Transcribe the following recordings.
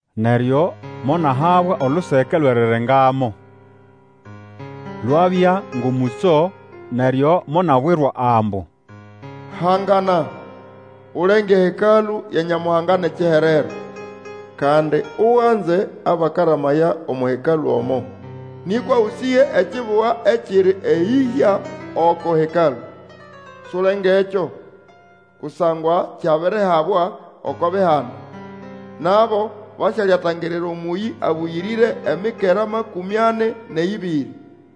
Neryo monahabwa oluseke olwʼerirengamo, lwabya ngʼomũtso, neryo monabwirwa ambu, Hangana, ulenge eHekalũ ya Nyamuhanga nʼekiherero, kandi uganze abakaramaya omo Hekalũ omo. Nĩkwa Ũsĩge ekibuga ekiri eyĩhya oko Hekalũ. Sulengekyo, kusangwa kyabirihabwa oko bihanda, nabo basyalyatangirira Omũyĩ Abũyĩrĩre emikera makũmĩ ani nʼeyĩbĩrĩ.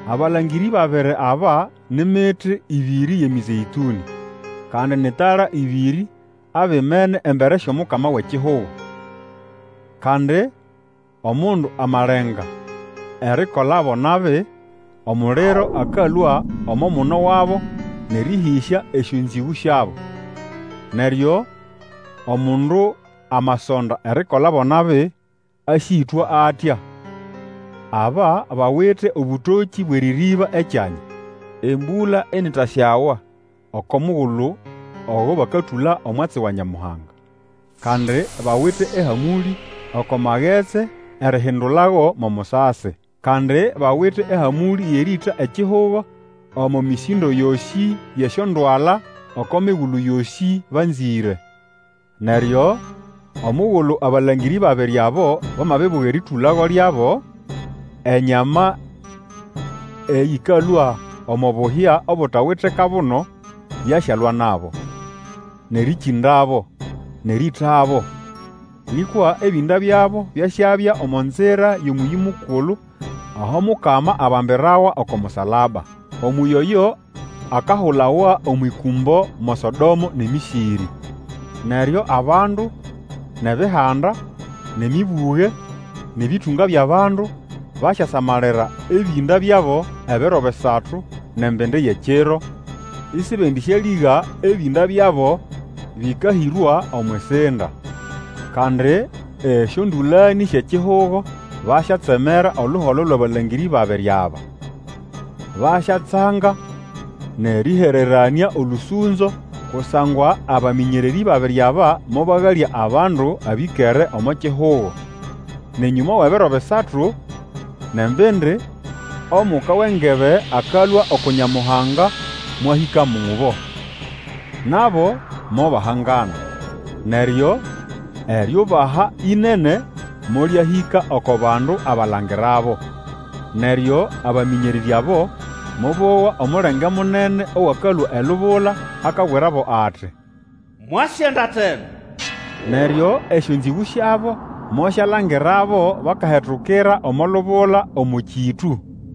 Abalangĩrĩ babiri aba ni miti ĩbĩrĩ yʼeMĩzeĩtũnĩ, kandi ni tala ĩbĩrĩ abimene embere syʼOmukama wʼekihugo. Kandi omundu amalenga erikolabo nabi, omuliro akalũa omo muno wabo nʼerĩhĩsya esyonzĩgũ syabo. Neryo omundu amasonda erikolabo nabi, asyĩtwa atya. Aba bawite obũtokĩ bwʼerĩrĩba ekyanya, embũla initasyawa oko mugulu ogo bakatũla omwatsi wa Nyamuhanga. Kandi bawite ehamũlĩ oko magetsi erihindulago mo musasi, kandi bawite ehamũlĩ yʼerĩĩta ekihugo omo mĩsĩndo yosĩ yʼesyondwala oko migulu yosĩ banzĩre. Neryo omugulu abalangĩrĩ babiri abo bamabibuga erĩtũlago lyabo, enyama eyĩkalũa omo buhya obutawite kabuno yasyalwa nabo, nʼerĩkĩndabo, nʼerĩĩtabo. Nĩkwa ebĩnda byabo byasyabya omo nzira yʼomũyĩ mukulu aho Mukama abambirawa oko musalaba. Omũyĩ oyo akahulawa omwʼĩkũmbo mo Sodomo nʼeMĩsĩrĩ. Neryo abandu, nʼEbihanda, nʼemĩbũge, nʼebĩtũnga byʼabandu, basyasamalira ebĩnda byabo ebiro bisatu nʼembindi yʼekiro, isibendĩsyalĩga ebĩnda byabo bĩkahĩrwa omwʼisinda. Kandi esyondũlanĩ syʼekihugo basyatsemera oluholo lwʼabalangĩrĩ babiri aba. Basyatsanga nʼerĩhereranĩa olũsũnzo, kusangwa abamĩnyererĩ babiri aba mobagalya abandu abĩkere omo kihugo. Nʼenyũma wʼebiro bisatu nʼembindi, omuka wʼengebe akalũa uku Nyamuhanga mwahĩka mubo, nabo mobahangana, neryo eriubaha ĩnene molyahĩka oko bandu abalangirabo. Neryo abamĩnyererĩ abo mobowa omulenge munene owakalũa elubula, akabwirabo ati, Mwase endata eno! Neryo esyonzĩgũ syabo mosyalangirabo bakahetukira omo lubula omo kĩtũ.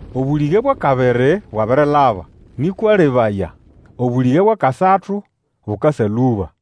Obũlĩge bwʼakabiri bwabirilaba, nĩkwa lebaya, obũlĩge bwʼakasatu bukasa lũba.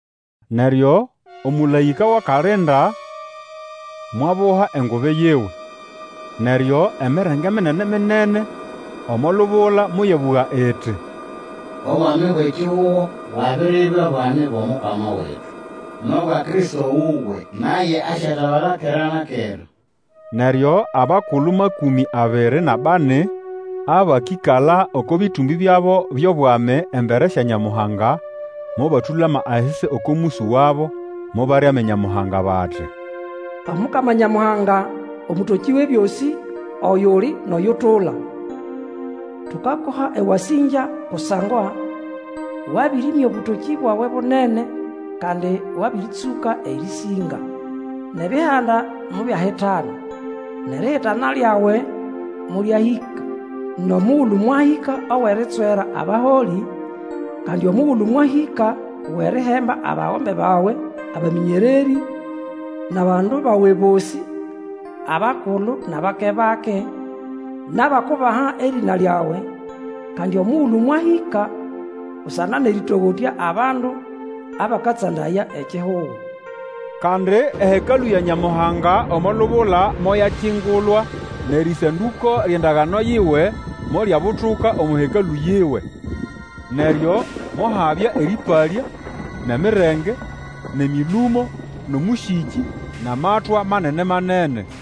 Neryo omũlaĩka wʼakalinda mwabuha engubi yiwe, neryo emirenge minene-minene omo lubula moyabũga iti, Obwami bwʼekihugo bwabiribya bwami bwʼomukama wetu, nʼobwa Kristo wuwe, naye asyatabala kera na kera! Neryo abakulu makũmĩ abiri nʼabani abakĩkala oko bĩtumbĩ byabo byʼobwami embere sya Nyamuhanga, mobatũlama ahisi oko mũsũ wabo, mobaramya Nyamuhanga bati, Omukama Nyamuhanga, Omũtokĩ Wʼebyosĩ, oyuli, nʼoyutula! Tukakuha ewasĩngya kusangwa wabĩrĩmya obũtokĩ bwawe bunene, Kandi wabĩrĩtsũka erĩsĩnga! Nʼebihanda mobyahitana, Nʼerihitana lyawe molyahĩka, Nʼomugulu mwahĩka owʼeritswera abaholĩ, Kandi omugulu mwahĩka owʼerihemba abagombe bawe abamĩnyererĩ, Nʼabandu bawe bosĩ, abakulu, nʼabake-bake, Nʼabakubaha erĩna lyawe, Kandi omugulu mwahĩka busana nʼerĩtogotya Abandu abakatsandaya ekihugo! Kandi eHekalũ ya Nyamuhanga omo lubula moyakingulwa, nʼerĩsandũko lyʼendagano yiwe molyabutuka omo Hekalũ yiwe. Neryo mohabya erĩpalya, nʼemirenge, nʼemĩlũmo, nʼomũsĩkĩ, nʼamatwa manene-manene.